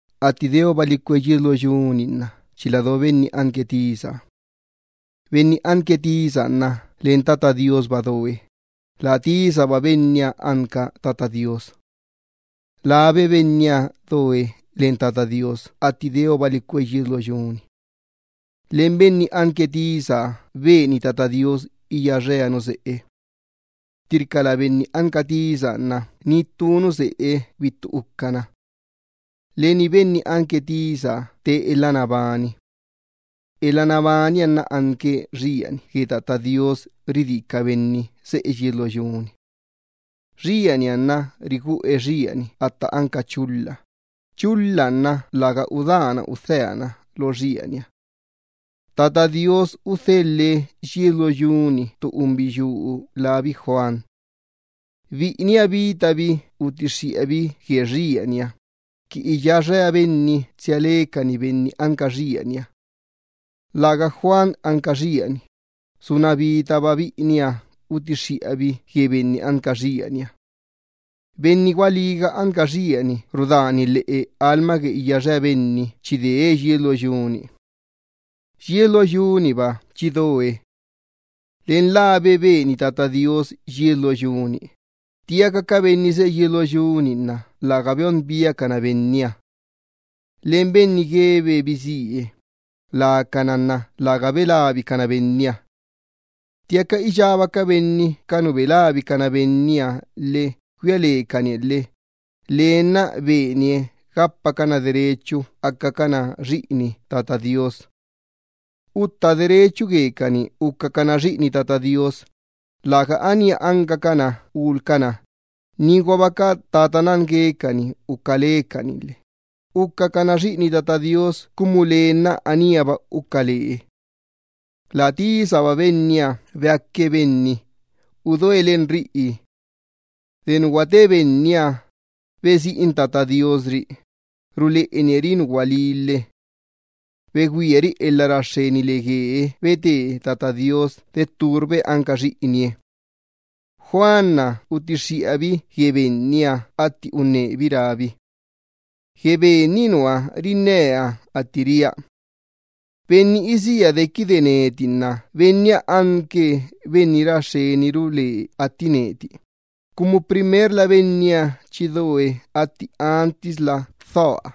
Atti deobali cue yies lo yu-ni nna chila do Benni anque tisa-na. Benni anque tisaha nna len Tata Do Iyyabaahaba doe, la tisahaba Benniha anque Tata Do Iyyabaaha. Labe Benniha doe len Tata Do Iyyabaaha atti deobali cue yies lo yu-ni. Len Benni anque tisaha beni Tata Do Iyyabaaha iyáxea nu seꞌe. Ttirca lä Benni anque tisaha nna ni ttu nu seꞌe bittu ucana. Leni Benni anque tisa te elha nabani. Elha nabaniha nna anque xieni gue Tata Do Iyyabaaha ridí ca benni seꞌe yies lo yu-ni. Xianiha nna riguꞌe xieni atta anca chulha, chulhaha nna läga udána udheana lo xieniha. Tata Do Iyyabaaha udhelhe yies lo yu-ni ttu unbiyuu lábi Juan. Biꞌiniha bitabi utixxiꞌabi gue xieniha, qui iyáxea benni tsia lecani Benni anca xieniha. Läga Juan anca xieni, suna bitaba biꞌiniha utixxiꞌabi gue Benni anca xieniha. Benni gualíga anca xieni rudani lhiꞌu lheꞌe lastoo iyáxea benni chi dee yies lo yu-ni. Yies lo yu-niba chi doe. Len labe beni Tata Do Iyyabaaha yies lo yu-ni, ttiaca ca benni seꞌe yies lo yu-ni nna läga beon biacana Benniha. Len benni guebe bisíe, lacana nna läga belabicana Benniha. Ttiaca iyába ca benni ca nu belabicana Benniha lhe güia lecanie lhe, lee nna benie gapacana derechu acacana xiꞌini Tata Do Iyyabaaha. Beꞌeyucana ucacana xiꞌini Tata Do Iyyabaaha, läga anía ancacana ulcana, niguaba ca tata nan guecani uca lecani lhe, ucacana xiꞌini Tata Do Iyyabaaha cumu lee nna aníaba uca lee. La tisaba Benniha beaque benni, udoe len riꞌi. De nu guate Benniha, besiꞌin Tata Do Iyyabaaha ri, ruleꞌenie ri nu gualí lhe. Begüiari elha ra xxen le guee bete Tata Do Iyyabaaha de tturba Benniha anque xiꞌinie. Juan utixxiꞌabi gue Benniha atti unnebi rábi: —Gue Ben-ni nua rinnea atti ria: “Benni isía dequide neti nna Benniha anque Benni ra xxeniru lee atti neti, cumu primerla Benniha chi doe atti antisla dhoa.”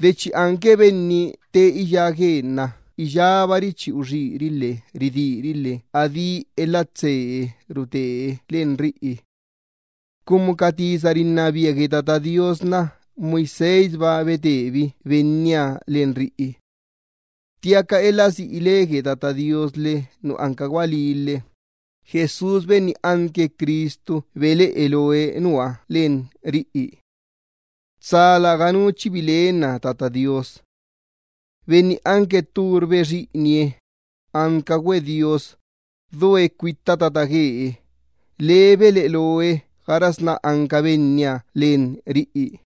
De chi anque Benni te iyá guee nna iyábari chi uxíri lhe ridíri lhe adí elha tsee rute len riꞌi. Cumu ca ley gue Tata Do Iyyabaaha nna Moisésba betebi Benniha len riꞌi. Ttiaca elha siꞌi le gue Tata Do Iyyabaaha lhe nu anca gualí lhe, Jesús Benni anque Cristu beleꞌe loe Ben-na len riꞌi. Tsa läganu chi bilenna Tata Do Iyyabaaha. Benni anque tturbe xiꞌinie, ancaguabe Dios, doe cuitta tata guee, Ben-na beleꞌe loe gaxasná anca Benniha len riꞌi.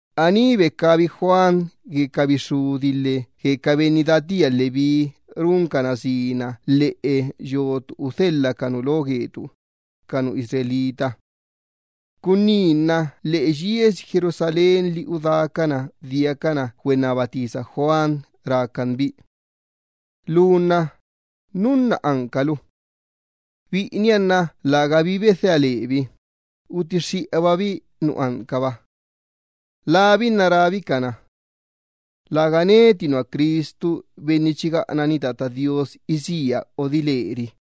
Aní becabi Juan gue ca bixxudi lhe gue ca benni datía Leví runcana sina gue yotu udhelha ca nu lo gue ca benni Israel. Cunní nna lheꞌe yiesi Jerusalén li udácana diacana güennaba tisa Juan rácan bi: —Lu nna ¿núnna ancalu? Biꞌiniha nna lägabi bedhea lebi, utixxiꞌababi nu ancaba. Labi nna rábi cana: —Läga neti nua Cristu Benni chi gaꞌanani Tata Do Iyyabaaha isía odile ri.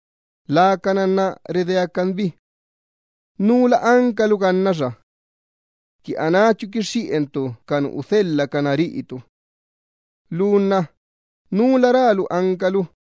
Lacana nna redeácan bi: —¿Núla ancalu gannaxa? Qui anáchu quixxiꞌentu ca nu udhelhacana riꞌitu. Lu nna ¿núla rálu ancalu?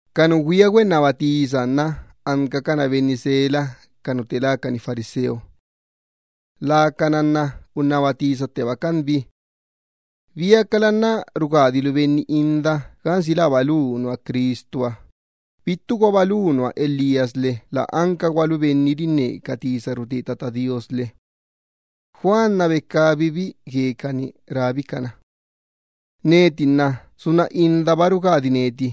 Ca nu güia güennaba tisaha nna ancacana benni sela ca nu fariseo. Lacana nna unnaba tisattebacan bi rácanbi: —¿Biacala nna rugadilu benni inda gansi läba lu nua Cristuha, bittuguaba lu nua Elías lhe bittuguaba ancalu profeta lhe? Juan becabibi guecani rábi cana: —Neti nna suntteba inda rugadia benni,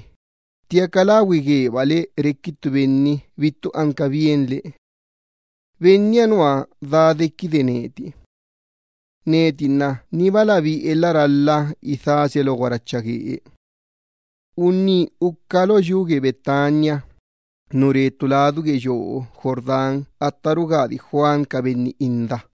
ttiaca lagüi guebale requi ttu benni bittu anca bienle. Benniha nua daa dequide neti. Neti nna nibala bi elha ralha idhasia lo guaracha guee. Unní uca lo yu lá Betania, nu re ttu ladu gue yoo Jordán atta rugadi Juan ca benni inda.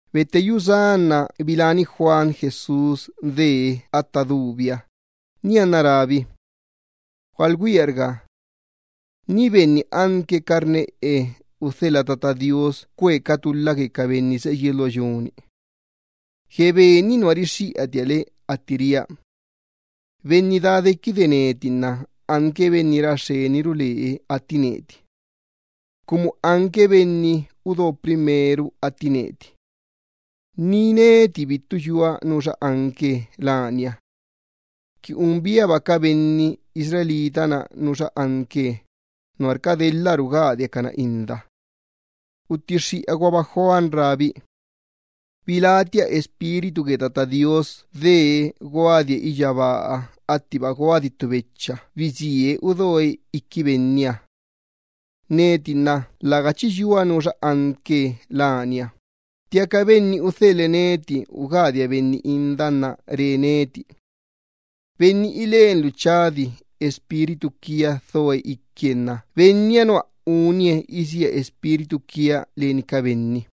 Betteyú sá nna biláni Juan Jesús dee atta dubiha, nianna rábi: —¡Gualgüiarga! Ni benni anque carneꞌe udhelha Tata Do Iyyabaaha qui cue ca tulha gue ca benni seꞌe yies lo yu-ni. Gue Ben-ni nua rixxiꞌatia le atti ria: “Benni daa dequide neti nna anque Benni ra xxeni ru lee atti neti. Cumu anque Benni udo primero atti neti.” Ni neti bittu yua nuxa anque lania. Qui un biaba ca benni Israel-na nuxa anque, nuarca delha rugadia cana inda. Utixxiꞌaguaba Juan rábi: —Bilátia Espíritu gue Tata Do Iyyabaaha dee guadie iyyabaaha attiba ttu becha bisíe udoe iqui Benniha. Neti nna läga chi yua nuxa anque lania, ttiaca Benni udhelhe neti ugadia benni inda Benniha re neti: “Benni ilenlu chadi Espíritu quia dhoe iquie, Benniha nua ugadie ca benni inda leni Espíritu quiaha.”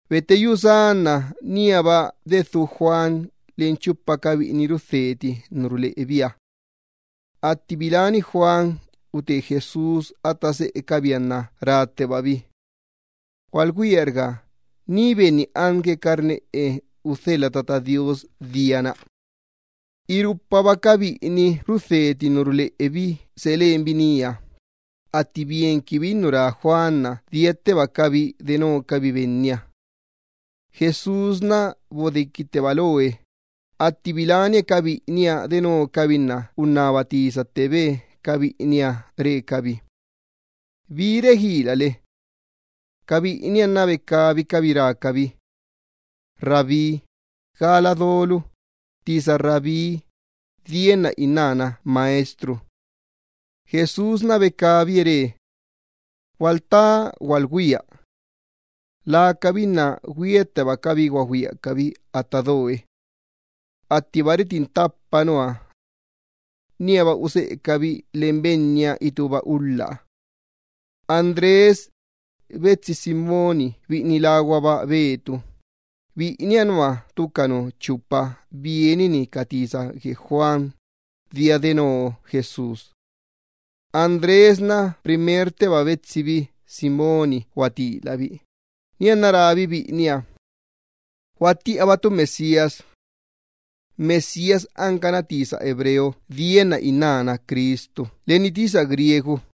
Betteyú sá nna níaba dedhú Juan leni chupa ca biꞌini rudheti ca tisa ruleꞌebiha. Atti biláni Juan ute Jesús atta seꞌecabiha nna ráttebabi: —¡Gualgüiarga! Ni benni anque carneꞌe udhelha Tata Do Iyyabaaha dia-na. Irupaba ca biꞌini rudheti ca tisa ruleꞌe Juan seꞌe lenbi nía, atti bienquinbi nu rá biꞌiniha nna diattebacabi denocabi Benniha. Jesús bodequitteba loe, atti bilánie ca biꞌiniha denocabi nna unnaba tisattebe ca biꞌiniha re cabi: —¿Bi reguilale? Ca biꞌiniha nna becabicabi rácabi: —Rabí, ¿gala dolu? (Tisa rabí dienna innána maestru.) Jesús becabie re: —Gualtá gualgüia. Nianna, güiattebacabi guagüiacabi atta do Benniha attiba tu retin ttapa nua. Lacabi nna níaba useꞌecabi len Benniha itúba ulhaha. Andrés betsi Simón biꞌini láguaba Pedro, biꞌiniha nua ttu ca nu chupa bienini ca tisa rixxiꞌa Juan, dia deno Jesús. Andrés nna primertteba betsibi Simón guatilabi, nianna rábi biꞌiniha: —Guattiꞌabatu Mesías. (Mesías ancana tisa hebreo dienna innána Cristu len tisa griego.)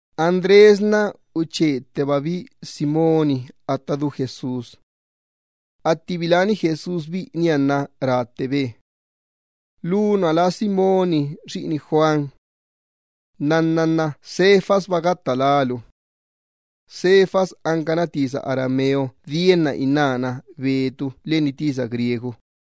Andrés nna uchettebabi Simón atta du Jesús. Atti biláni Jesús biꞌiniha nna ráttebe: —Lu nua lá Simóni xiꞌini Juan. Nnanna nna Cefasba gatta lálu. (Cefas ancana tisa arameo dienna innána Pedro leni tisa griego.)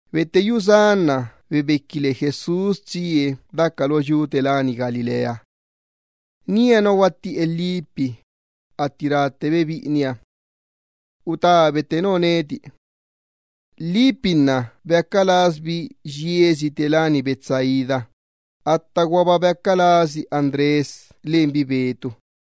Betteyú sá nna bebequi le Jesús tsie daca lo yu gue Galilea. Nía nua guattiꞌe Felipe, atti ráttebe biꞌiniha: —Utá betteno neti. Felipe beaca lasbi yiesi Betsaida, attaguaba beaca lasi Andrés lenbi Pedro.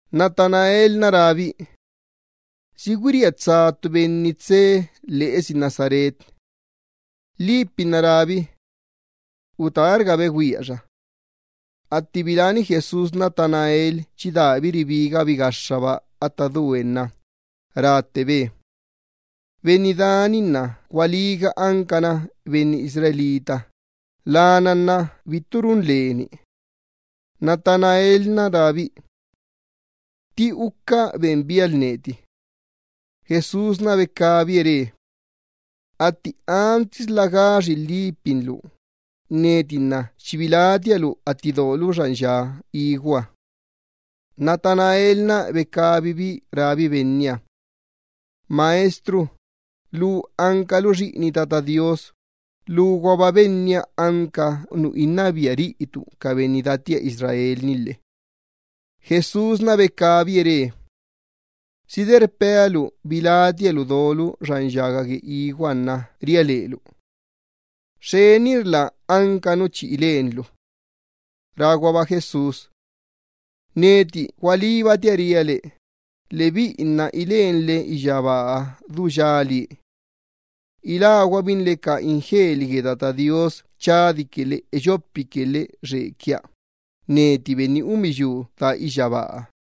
Natanael nna rábi: —¿Si güiría tsa ttu benni tsee lheꞌesi Nazaret? Felipe nna rábi: —Utárga begüia xa. Atti biláni Jesús Natanael chi dabi ribigabi gaxxaba atta due nna ráttebe: —Benni da-ni nna gualíga ancana benni Israel, lana nna bittu run leni. Natanael nna rábi: —¿Tti uca ben bialu neti? Jesús nna becabie re: —Atti antisla gaxi Felipe-na lu, neti nna chi bilátia lu atti dolu xan ya iguha. Natanael nna becabibi rábi Benniha: —Maestro, lu ancalu xiꞌini Tata Do Iyyabaaha, luguaba nua anca lu Benni rinnabia riꞌitu ca benni Israel-ni lhe. Jesús becabie re: —¿Si de rpea lu chi bilátia lu dolu xan yaga gue iguha nuarca ria lelu? Xxenirla anca nu chi ilenlu. Ráguaba Jesús: —Neti gualíbatia ria le, lebiꞌi nna ilenle iyyabaaha du yalie. Iláguabinle ca ingeli gue Tata Do Iyyabaaha chadique lhe eyopique lhe xequia, neti Benni unbiyuu daa iyyabaaha.